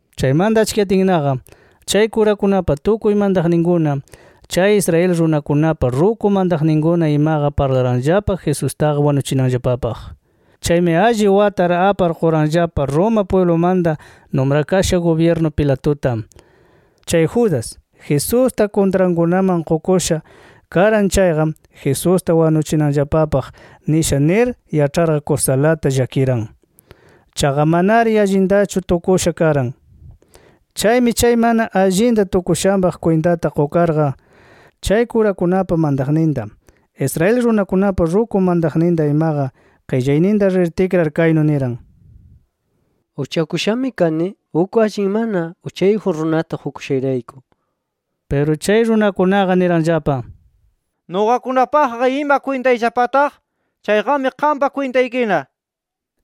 Chaymanta achkiyatinnaqa, chay kurakunapa tukuy mantaqninkuna, chay Israel runakunapa ruku mantaqninkuna imaqa parlaranllapa Jesustaqa wanuchinanllapapaq. Chaymi alli watar apar quranllapa Roma pwiblumanta numrakasha gubyirnu Pilatuta. Chay Judas, Jesusta kuntrankunaman qukusha karan chayqa, Jesusta wanuchinanllapapaq nisha nir yaĉharqa kusalata llakiran. Chaqa manari allintachu tukusha karan. Chaymi chay mana allinta tukushanpaq kwintata qukarqa, chay kurakunapa mantaqninta, Israel runakunapa ruku mantaqninta imaqa qillayninta rir tikrar kaynu niran: —Uchakushami kani uk allin mana uchayjun runata qukushayrayku nir. Piru chay runakunaqa niranllapa: —¿Nuqakunapaqqa ima kwintayllapataq? ¡Chayqami qampa kwintaykina! nir.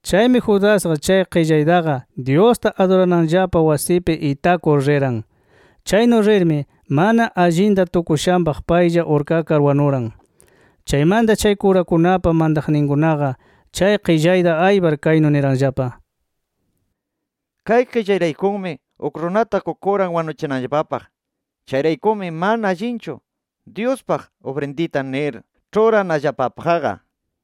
Chaymi Judasqa chay qillaytaqa Dyusta adurananllapa wasipi itakur riran. Chaynu rirmi mana allinta tukushanpaq paylla urkakar wanuran. Chaymanta chay kurakunapa mantaqninkunaqa chay qillayta aypar kaynu niranllapa: “Kay qillayraykumi uk runata qukuran wanuchinanllapapaq. Chayraykumi mana allinchu Dyuspaq ufrindita nir ĉhuranallapapaqqa” nir.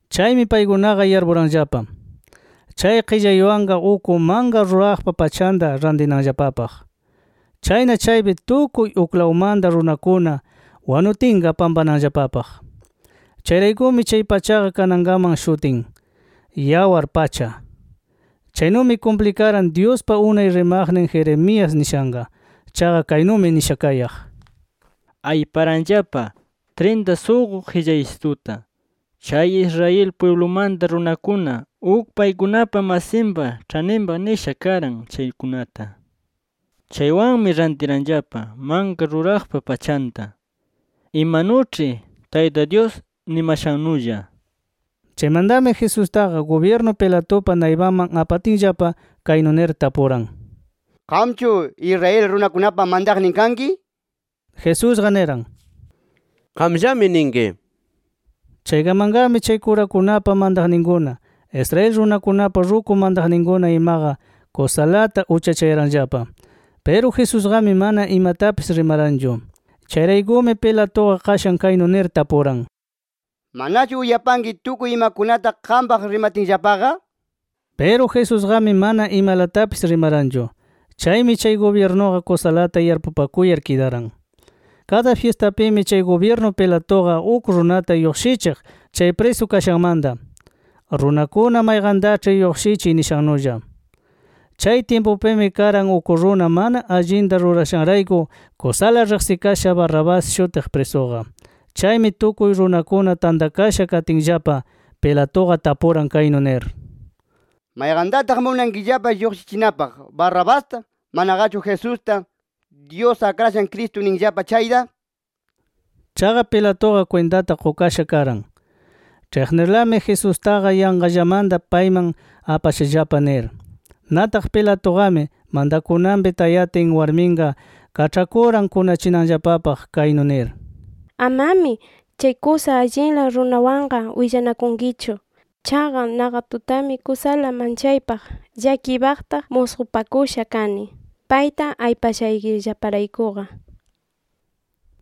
Chaymi paykunaqa yarpuranllapa, chay qillaywanqa uk manka ruraqpa pachanta rantinanllapapaq. Chayna chaypi tukuy uklawmanta runakuna wanutinqa pampananllapapaq. Chayraykumi chay pachaqa kanankaman shutin “Yawar Pacha”. Chaynumi kumplikaran Dyuspa unay rimaqnin Jeremías nishanqa. Chaqa kaynumi nisha kayaq: “Ayparanllapa trinta suqu qillaysituta, chay Israel pwiblumanta runakuna uk paykunapa masinpa ĉhaninpaq nisha karan chaykunata. Chaywanmi rantiranllapa manka ruraqpa pachanta, imanuĉhi Tayta Dyus nimashannulla” nir. Chaymantami Jesustaqa gubyirnu Pilatupa naypanman apatinllapa, kaynu nir tapuran: —¿Qamchu Israel runakunapa mantaqnin kanki? nir. Jesusqa niran: —Qamllami ninki. Chaykamanmi chay kurakunapa mantaqninkuna, Israel runakunapa ruku mantaqninkuna imaqa, kusalata uchachayaranllapa. Piru Jesusqami mana imatapis rimaranchu. Chayraykumi Pilatuqa qashan kaynu nir tapuran: —¿Manachu uyapanki tukuy imakunata qampaq rimatinllapaqa? nir. Piru Jesusqami mana imalatapis rimaranchu. Chaymi chay gubyirnuqa kusalata yarpupakuyar kidaran. Kada fyistapimi chay gubyirnu Pilatuqa uk runata lluqshichiq chay prisu kashanmanta, runakuna mayqantaĉhi lluqshichiy nishannulla. Chay tyimpupimi karan uk runa mana allinta rurashanrayku kusala riqsikasha Barrabás shutiq, prisuqa. Chaymi tukuy runakuna tantakasha katinllapa, Pilatuqa tapuran kaynu nir: “¿Mayqantataq munankillapa lluqshichinapaq, Barrabasta, manaqachu Jesusta, Dyus Akrashan Cristun ninllapa chayta?” nir. Chaqa Pilatuqa kwintata qukasha karan, ĉhiqnirlami Jesustaqa yanqallamanta payman apashallapa nir. Nataq Pilatuqami mantakunanpi tayatin warminqa kaĉhakuran kunachinanllapapaq kaynu nir: “Amami chay kusa allinla runawanqa willanakunkichu. Chaqa naqa tutami kusala manchaypaq llakiypaqta musqupakusha kani payta aypashaykillaparaykuqa” nir.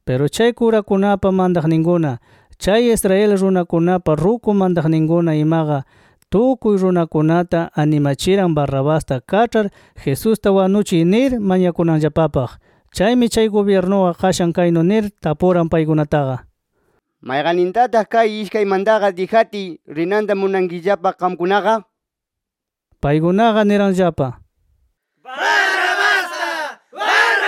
Piru chay kurakunapa mantaqninkuna, chay Israel runakunapa ruku mantaqninkuna imaqa, tukuy runakunata animachiran Barrabasta kaĉhar, Jesusta wanuchiy nir mañakunanllapapaq. Chaymi chay gubyirnuqa qashan kaynu nir tapuran paykunataqa: —¿Mayqannintataq kay ishkaymantaqa dijatiy rinanta munankillapa qamkunaqa? nir. Paykunaqa niranllapa: —¡Barrabasta! nir.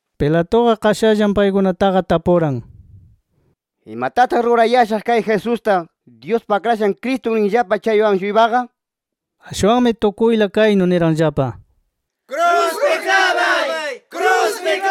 Pilatuqa qashallan paykunataqa tapuran: —¿Imatataq rurayashaq kay Jesusta, Dyuspa Akrashan Cristun ninllapa chaywan-shuypaqa? nir. Ashwanmi tukuyla kaynu niranllapa: —¡Kruspi klabay! nir.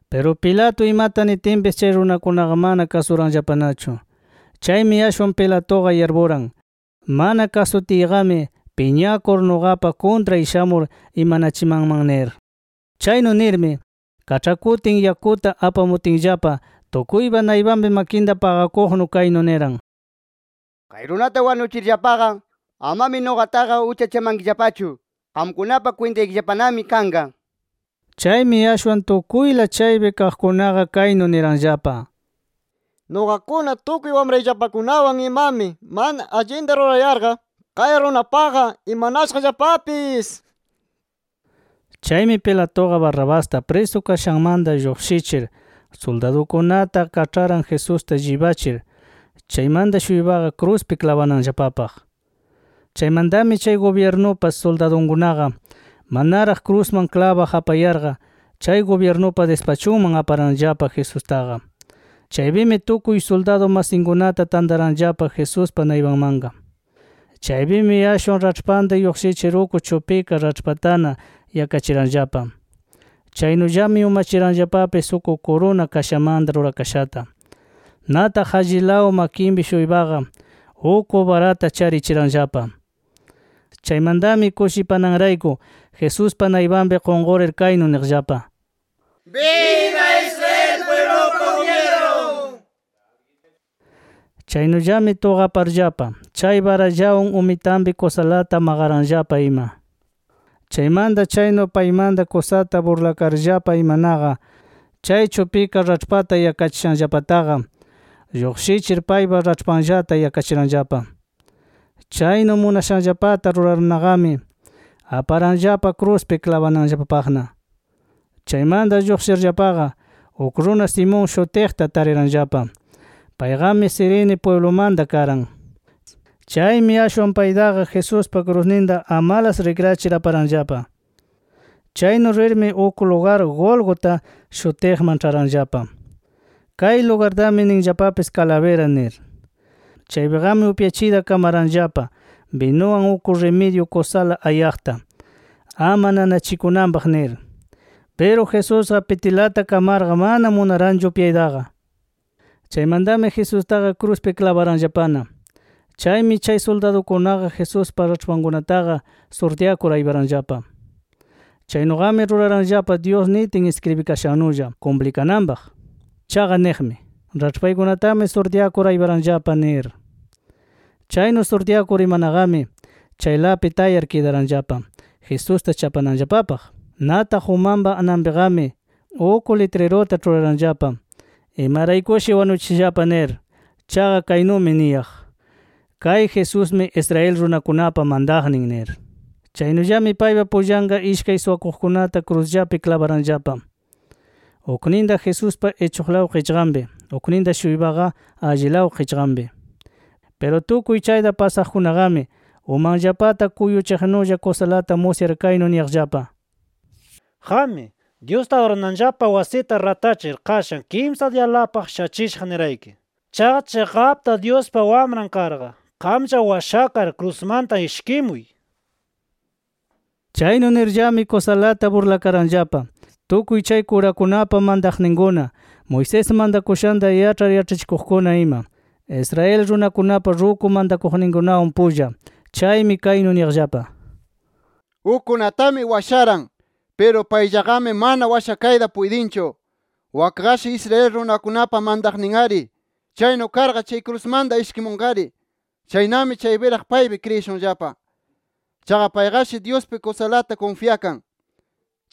Piru Pilato imata nitinpis chay runakunaqa mana kasuranllapanachu. Chaymi ashwan Pilatuqa yarpuran mana kasutiyqami piñakur nuqapa kuntray shamur imanachimanman nir. Chaynu nirmi kaĉhakutin yakuta apamutinllapa, tukuypa naypanpi makinta paqakuqnu kaynu niran: —Kay runata wanuchirllapaqa amami nuqataqa uchachamankillapachu. Qamkunapa kwintaykillapanami kanqa nir. Chaymi ashwan tukuyla chaypi kaqkunaqa kaynu niranllapa: —¡Nuqakuna, tukuy wamrayllapakunawan imami mana allinta rurayarqa, kay runapaqqa imanashaqllapapis! nir. Chaymi Pilatuqa Barrabasta prisu kashanmanta lluqshichir, suldadunkunata kaĉharan Jesusta llibachir, chaymanta-shuypaqa kruspi klabananllapapaq. Chaymantami chay gubyirnupa suldadunkunaqa manaraq krusman klabaq apayarqa, chay gubyirnupa dispachunman aparanllapa Jesustaqa. Chaypimi tukuy suldadu masinkunata tantaranllapa Jesuspa naypanmanqa. Chaypimi ashwan raĉhpanta lluqshichir uk chupika raĉhpatana yakachiranllapa. Chaynullami umachiranllapapis uk kuruna kashamanta rurakashata. Nataq allilaw makinpi-shuypaqa uk barata charichiranllapa. Chaymantami kushipananrayku Jesuspa naypanpi qunqurir, kaynu niqllapa: “¡Biba Israel pwiblupa gubyirnun!” nir. Chaynullami tuqaparllapa chay barallawan umitanpi kusalata maqaranllapa ima. Chaymanta chaynu paymanta kusata burlakarllapa imanaqa, chay chupika raĉhpata yakachishanllapataqa lluqshichir paypa raĉhpanllata yakachiranllapa. Chaynu munashanllapata rurarnaqami aparanllapa kruspi klabananllapapaqna. Chaymanta lluqshirllapaqa, uk runa Simón shutiqta tariranllapa. Payqami Cirene pwiblumanta karan. Chaymi ashwan paytaqa Jesuspa krusninta amalas rikrachir aparanllapa. Chaynu rirmi uk lugar Gólgota shutiqman ĉharanllapa. Kay lugartami ninllapapis Calavera nir. Chaypiqami upyachiyta kamaranllapa binuwan, uk rimidyu kusala ayaqta, ama nanachikunanpaq nir. Piru Jesusqa pitilata kamarqa mana munaranchu upyaytaqa. Chaymantami Jesustaqa kruspi klabaranllapana. Chaymi chay suldadukunaqa Jesuspa raĉhpankunataqa surtyakur ayparanllapa. [Chaynuqami ruraranllapa Dyus nitin iskribikashannulla kumplikananpaq. Chaqa niqmi: Raĉhpaykunatami surtyakur ayparanllapa nir]. Chaynu surtyakur imanaqami, chaylapi tayar kidaranllapa Jesusta chapananllapapaq. Nataq umanpa ananpiqami, uk litriruta ĉhuraranllapa imaraykushi wanuchishallapa nir. Chaqa kaynumi niyaq: “KAY JESUSMI ISRAEL RUNAKUNAPA MANTAQNIN” nir. Chaynullami paypa pullanqa ishkay suwakuqkunata krusllapi klabaranllapa, ukninta Jesuspa ichuqlaw qichqanpi, ukninta-shuypaqa allilaw qichqanpi. Piru tukuy chayta pasaqkunaqami, umanllapata kuyuchiqnulla kusalata musyar kaynu niyaqllapa: “¡Qammi, Dyusta adurananllapa wasita ratachir qashan kimsa diyalapaq shachishaq nirayki! ¡Chaqa chiqapta Dyuspa Wamran karqa, qamlla washakar krusmanta ishkimuy!” nir. Chaynu nirllami kusalata burlakaranllapa tukuy chay kurakunapa mantaqninkuna, Moisés mantakushanta yaĉhar yaĉhachikuqkuna ima, Israel runakunapa ruku mantaqninkunawan pulla. Chaymi kaynu niyaqllapa: “Ukkunatami washaran. Piru payllaqami mana washakayta puytinchu. Wakqashi Israel runakunapa mantaqnin-ari. ¡Chaynu karqa chay krusmanta ishkimunqari! ¡Chaynami chaypiraq paypi kriyishunllapa! Chaqa payqashi Dyuspi kusalata kunfyakan.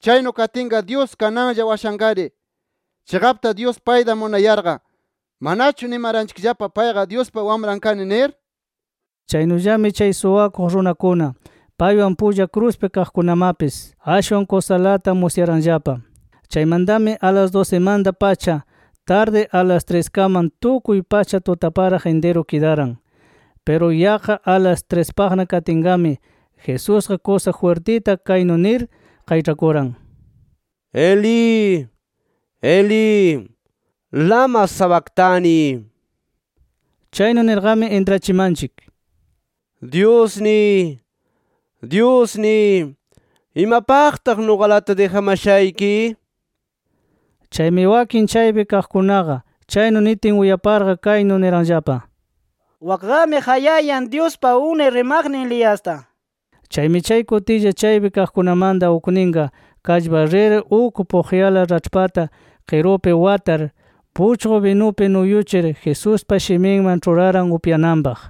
Chaynu katinqa Dyus kananlla washanqari. ¡Chiqapta Dyus payta munayarqa! ¿Manachu nimaranchikllapa payqa: ‘Dyuspa Wamran kani’ nir?” Chaynullami chay suwakuq runakuna paywan pulla kruspi kaqkunamapis ashwan kusalata musyaranllapa. Chaymantami a las dusimanta-pacha tardi a las triskaman tukuy pacha tutaparaq intiru kidaran. Piru yaqqa a las trispaqna katinqami Jesusqa kusa jwirtita kaynu nir qayĉhakuran: “Elí, Elí, ¿lama sabactani?” nir. (Chaynu nirqami intrachimanchik: “Dyusniy, Dyusniy ¿imapaqtaq nuqalata dijamashayki?” nir.) Chaymi wakin chaypi kaqkunaqa chaynu nitin uyaparqa kaynu niranllapa: “Wakqami qayayan Dyuspa unay rimaqnin Eliasta” nir. Chaymi chay kutilla chaypi kaqkunamanta ukninqa kallpar rir uk puqyala raĉhpata qirupi watar, puchqu binupi nuyuchir Jesuspa shiminman ĉhuraran upyananpaq.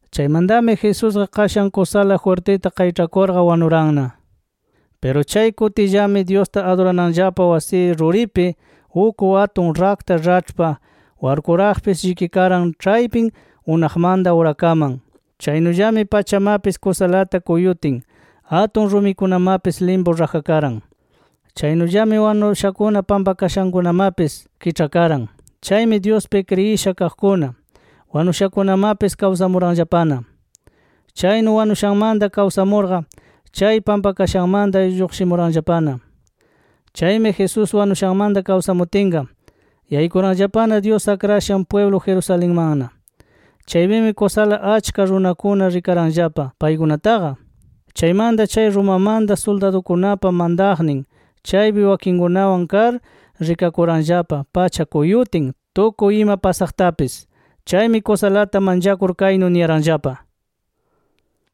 Chaymantami Jesusqa qashan kusala jwirtita qayĉhakurqa wanuranna. Piru chay kutillami Dyusta adurananllapa wasi ruripi uk atun rakta raĉhpa warkuraqpis llikikaran ĉhaypin unaqmanta urakaman. Chaynullami pachamapis kusalata kuyutin atun rumikunamapis limpu rajakaran. Chaynullami wanushakuna pampakashankunamapis kiĉhakaran. Chaymi Dyuspi kriyisha kaqkuna wanushakunamapis kawsamuranllapana. Chaynu wanushanmanta kawsamurqa chay pampakashanmanta lluqshimuranllapana. Chaymi Jesús wanushanmanta kawsamutinqa, yaykuranllapana Dyus akrashan pwiblu Jerusalenmanna. Chaypimi kusala achka runakuna rikaranllapa paykunataqa. Chaymanta chay Romamanta suldadukunapa mantaqnin chaypi wakinkunawan kar rikakuranllapa pacha kuyutin, tukuy ima pasaqtapis. Chaymi kusalata manchakur kaynu niyaranllapa: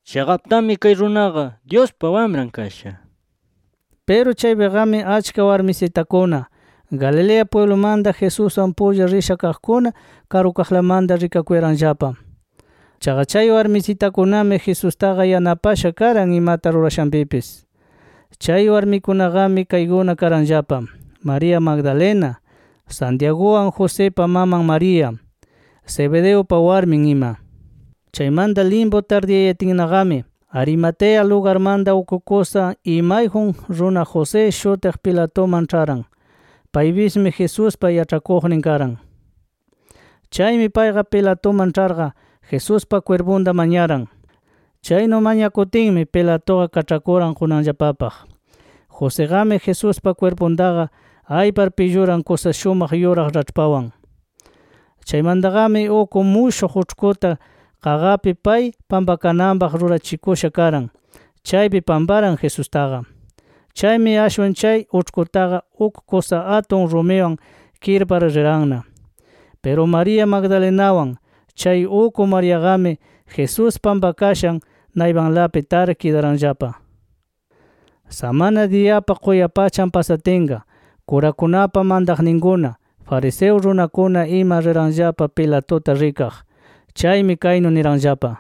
“¡Chiqaptami kay runaqa Dyuspa Wamran kasha!” nir. Piru chaypiqami achka warmisitakuna Galilea pwiblumanta Jesuswan pulla risha kaqkuna karukaqlamanta rikakuyaranllapa. Chaqa chay warmisitakunami Jesustaqa yanapasha karan imata rurashanpipis. Chay warmikunaqami kaykuna karanllapa: María Magdalena, Santiaguwan Josipa maman María, Zebedeupa warmin ima. Chaymanta limpu tardiyayatinnaqami Arimatea lugarmanta uk kusa imayjun runa José shutiq Pilatuman ĉharan. Paypismi Jesuspa yaĉhakuqnin karan. Chaymi payqa Pilatuman ĉharqa, Jesuspa kwirpunta mañaran. Chaynu mañakutinmi Pilatuqa kaĉhakuran qunanllapapaq. Josiqami Jesuspa kwirpuntaqa aypar pilluran kusa shumaq yuraq raĉhpawan. Chaymantaqami uk mushuq uĉhkuta qaqapi pay pampakananpaq rurachikusha karan, chaypi pamparan Jesustaqa. Chaymi ashwan chay uĉhkutaqa uk kusa atun rumiwan kirpar riranna. Piru María Magdalenawan, chay uk Mariaqami Jesús pampakashan naypanlapi tar kidaranllapa. Samana diyapa quyapachan pasatinqa, kurakunapa mantaqninkuna, fariseo runakuna ima, riranllapa Pilatuta rikaq. Chaymi kaynu niranllapa: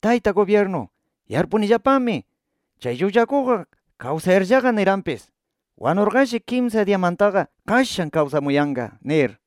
—Tayta gubyirnu, yarpunillapami chay llullakuqqa kawsayarllaqa niranpis, ‘Wanurqashi kimsa diyamantaqa qashan kawsamuyanqa’ nir.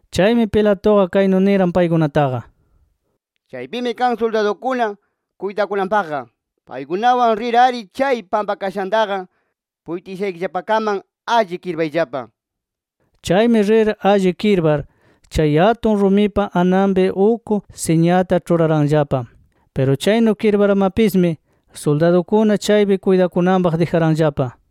Chaymi Pilatuqa kaynu niran paykunataqa: —Chaypimi kan suldadukuna kuytakunanpaqqa. Paykunawan rir-ari chay pampakashantaqa puytishaykillapakaman alli kirpayllapa. Chaymi rir alli kirpar, chay atun rumipa ananpi uk siñata ĉhuraranllapa. Piru chaynu kirparmapismi suldadukuna chaypi kuytakunanpaq dijaranllapa.